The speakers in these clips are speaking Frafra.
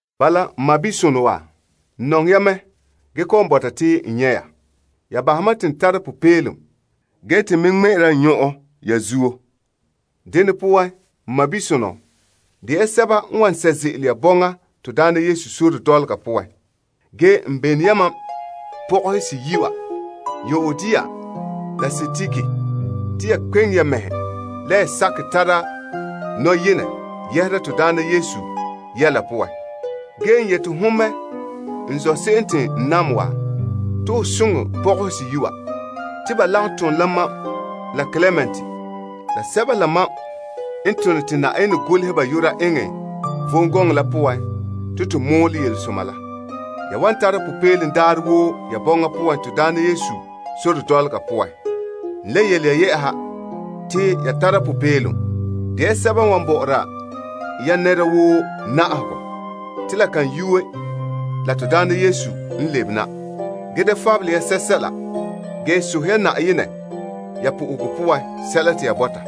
Bala, n sɔɔnsonɔ wa, n nɔŋɛ ya mɛ ge kɔ'ɔn bɔta te n nyɛ' ya. Ya bahɛ mam te n tara popeelom ge te n me ŋmɛ'ɛra n nyɔn'ɔn ya zuo. Dene poan, n sɔɔnsonɔ, de ya sɛba n wan sɛ' ze'ele ya Na'ayenɛ sore dɔlɔga poan. Ge n bene yamam pɔgɔhe seyi' wa, Euodia la Sintike te ya kpeŋe ya mɛhe la ya sakɛ tara nɔyenɛ yɛhera Na'ayenɛ yɛla poan. Ge n yeti hon me n zɔ' se'em te n nam wa, te ho soŋɛ pɔgɔhe seyi' wa. Ba lagom tom la mam la Klement, yelesoma mɔɔlegɔ poan la sɛba woo n tone te Yenɛ golehɛ ba yu'ura eŋɛ vom gɔŋɔ la poan la. Ya wan tara popeelom daarɛ woo ya bɔŋa poan to daana Yesu sore dɔlɔga poan. N le yele ya te ya tara popeelom. De ya sɛba n wan bo'ore ya nɛra woo na'ahegɔ. Te la kan yuue la Na'ayenɛ n lebe na. Ge da fabele ya sɛsɛla, ge sohɛ ya Yenɛ ya po'ohegɔ poan sɛla te ya bɔta.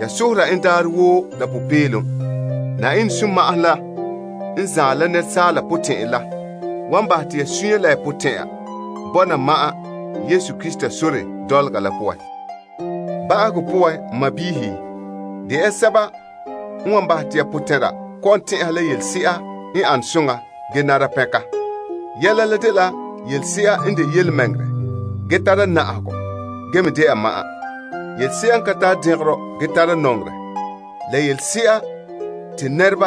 Ya sohora en daarɛ woo la popeelom. Yenɛ sunma'ahom la n gaŋɛ la asaala bɔkerɛ la, wan bahɛ te ya suunre la ya potɛn'ɛra bɔna ma'an Krista Yesu sore dɔlɔga la poan. Ba'ahegɔ poan, n sɔɔnrɔ, de ya sɛba n wan bahɛ te ya potɛn'ɛra kɔ'ɔn tɛn'ɛha la yelese'a n ane soŋa ge nara pɛnka. Yɛla la dela yelese'a n de yelemɛŋɛrɛ ge tara na'ahegɔ ge me dɛna ma'an. Yelese'a la n ka tara dɛngerɔ ge tara nɔŋerɛ, la yelese'a n nare.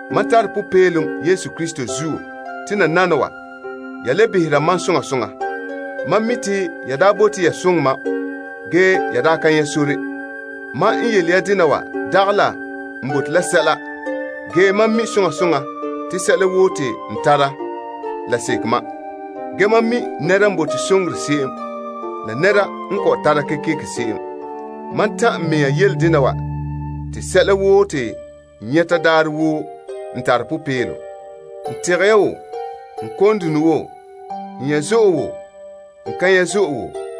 Mam tare popeelom Na'ayenɛ zuo te nananawa, ya le behera mam soŋa soŋa. Mam mi' te ya daa bote ya soŋɛ mam, ge ya daa ka nyɛ' sore. Mam n yele ya dena wa dagɛ la n bote la sɛla, ge mam mi' soŋa soŋa te sɛla woo te n tara, la seke mam. Mam mi' nɛra n ka tare n ane se'em la nɛra n tare gaŋɛ n ane se'em. Mam ta'an n mɛŋa yele dena wa te sɛla woo te n nyɛta daarɛ woo n tare popeelom. N tegɛ ya wo, n kon dune wo, n nyɛ' zo'e wo n ka nyɛ' zo'e wo.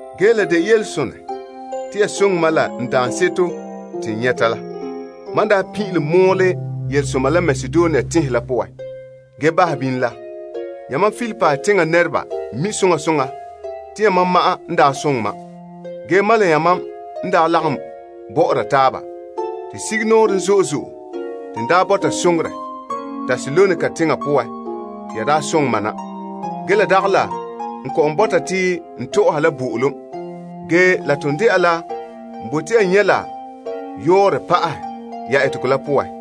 Ge la de yelesonɛ te ya soŋɛ mam la n daanseto te n nyɛta la. Mam daa pin'ilom mɔɔlɛ yelesoma la Makedonia teŋhe la poan, ge bahɛ bini la, yamam Filipi teŋa nɛreba mi' soŋa soŋa te yamam ma'an n daa soŋɛ mam. Ge mam la yamam n daa lagom bɔ'ɔra taaba. Te sugumnɔɔren zo'e zo'e te n daa bɔta soŋorɛ Tesalonika teŋa poan te ya daa soŋɛ mam na. Ge la dagɛ la n kɔ'ɔn bɔta te n tɔ'ɔha la bo'olom, ge la ton dɛna la n bote ya nyɛ' la yɔɔrɔ pa'ahɛ ya etegɔ la poan.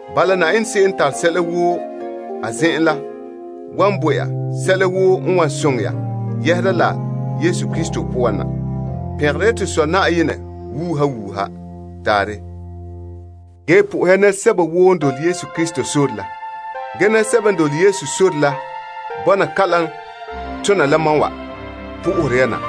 Bala, Yenɛ se'em n tare sɛla woo a zen'en la wan bo ya sɛla woo n wan soŋɛ ya yɛhera la Krista Yesu poan na. Pɛngera ya to Sɔ Na'ayenɛ wuuha wuuha. Taarɛ. Ge po'ohɛ ya nɛresɛba woo n dole Krista Yesu sore la. Ge nɛresɛba n dole Yesu sore la bɔna kalam tona la mam wa po'ohere ya na.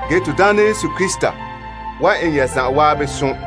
Ge Na'ayenɛ Yesu Krista wan eŋɛ ya zan'an som.